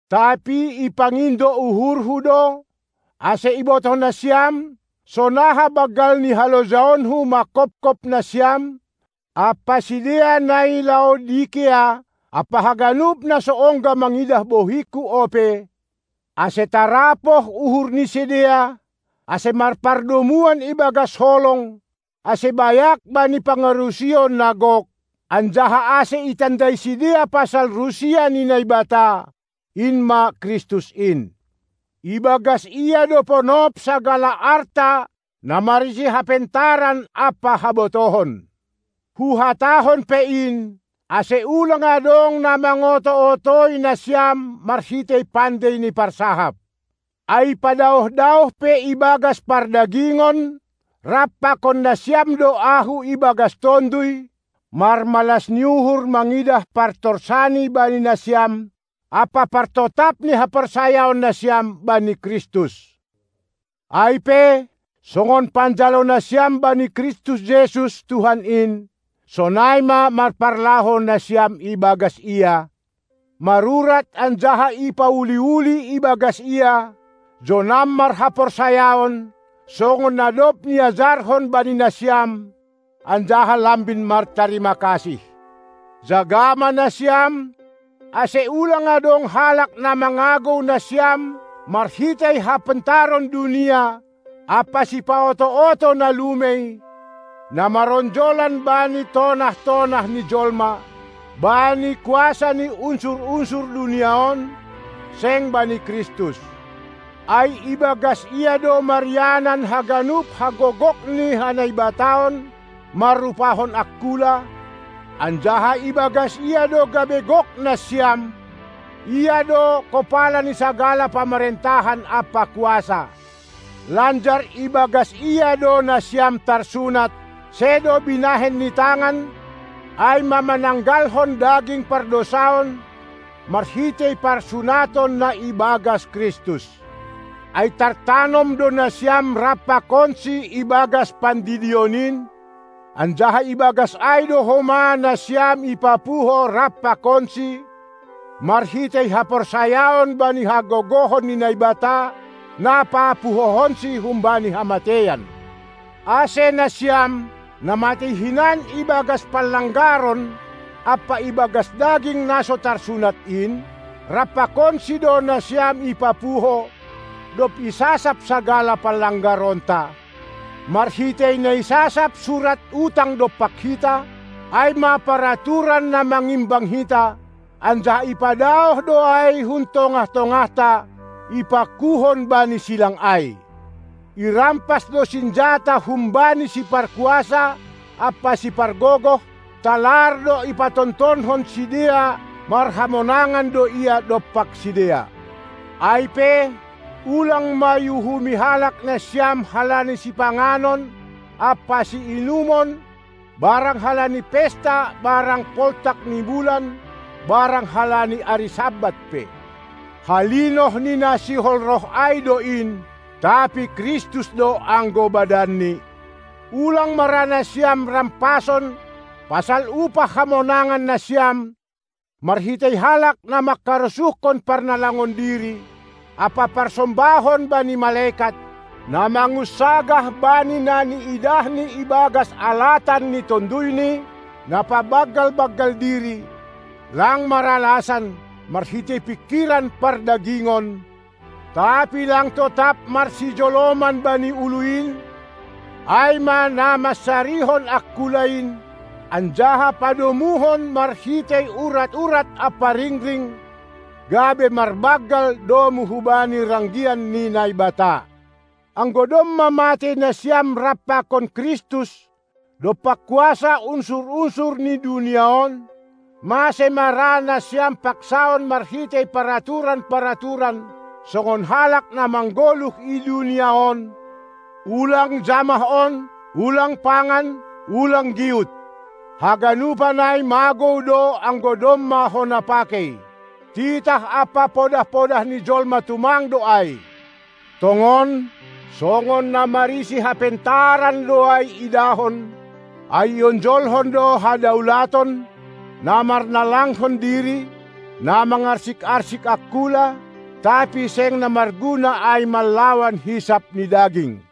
Tapi ipangindo uhurhu do, ase ibotoh nasiam, sonaha banggal ni halojaonku manghophop nasiam ampa sidea na i Laodikea, ampa haganup, na so ongga mangidah bohingku ope, ase tarapoh uhur ni sidea, ase marpardomuan ibagas holong, ase bayak bani pangarusion na gok, anjaha ase itandai sidea pasal rusia ni Naibata, in ma Kristus in. Ibagas Ia do ponop sagala arta na marisi hapentaran ampa habotohon. Huhatahon pe in, ase ulang adong na mangoto-otoi nasiam marhitei pandei ni parsahap. Ai padaoh-daoh pe ibagas pardagingon, rap pakon nasiam do ahu ibagas tonduy, marmalas ni uhur mangidah partorsani bani nasiam ampa partotap ni haporsayaon nasiam bani Kristus. Ai pe, songon panjalo nasiam bani Kristus Jesus, Tuhan in, sonai ma marparlahou nasiam ibagas Ia, marurat anjaha ipauli-uli ibagas Ia, jonam marhaporsayaon, songon na dob niajarhon bani nasiam, anjaha lambin martarima kasih. Jaga ma nasiam, ase ulang adong halak na mangagou nasiam marhitei hapentaron dunia ampa sipaoto-oto na lumei, na maronjolan bani tonah-tonah ni jolma, bani kuasa ni unsur-unsur dunia on, seng bani Kristus. Ai ibagas Ia do marianan haganup hagogok ni hanaibataon marrupahon angkula, anjaha ibagas Ia do gabe gok nasiam; Ia do kopala ni sagala pamarentahan ampa kuasa. Lanjar ibagas Ia do nasiam tarsunat, sedo binahen ni tangan, ai ma mananggalhon daging pardousaon, marhitei parsunaton na ibagas Kristus. Ai tartanom do nasiam rap pakonSi ibagas pandidion in, anjaha ibagas ai do homa nasiam ipapuho rap pakonSi marhitei haporsayaon bani hagogohon ni Naibata, na papuhohonSi humbani hamateian. Ase nasiam, na matei hinan ibagas panlanggaron ampa ibagas daging na so tarsunat in, rap pakonSi do nasiam ipapuho, dob isasap sagala panlanggaronta, marhitei na isasap surat utang dompak hita, ai ma paraturan na mangimbang hita, anjaha ipadaoh do ai hun tongah-tongahta, ipakuhon bani silang ai. Irampas do sinjata humbani siparkuasa ampa sipargogoh; talar do ipatontonkon sidea, marhamonangan do Ia dompak sidea. Ai pe, ulang ma iuhumi halak nasiam halani sipanganon ampa siinumon barang halani pesta barang poltak ni bulan barang halani ari Sabat pe. Halinoh ni na sihol roh ai do in, tapi Kristus do anggo badanni. Ulang ma ra nasiam rampason pasal upah hamonangan nasiam marhitei halak, na mangkarosuhkon parnalangon diri ampa parsombahon bani malekat, na mangunsagah bani na niidahni ibagas alatan ni tonduyni, na pabanggal-banggal diri, lang maralasan, marhitei pingkiran pardagingon, tapi lang totap marsijoloman bani ulu in, ai ma na mansarihon angkula in anjaha padomuhon marhitei urat-urat ampa ringring, gabe marbanggal domu hubani ranggian ni Naibata. Anggo domma matei nasiam rap pakon Kristus dompak kuasa unsur-unsur ni dunia on, mase ma ra nasiam paksaon marhitei paraturan-paraturan, songon halak na manggoluh i dunia on: Ulang jamah on, ulang pangan, ulang giut! Haganupan ai magou do anggo domma hona pakei. Titah ampa podah-podah ni jolma tumang do ai. Tongon, songon na marisi hapentaran do ai idahon, ai ionjolhon do hadaulaton, na marnalangkon diri, na mangarsik-arsik angkula; tapi seng na marguna ai manlawan hisap ni daging.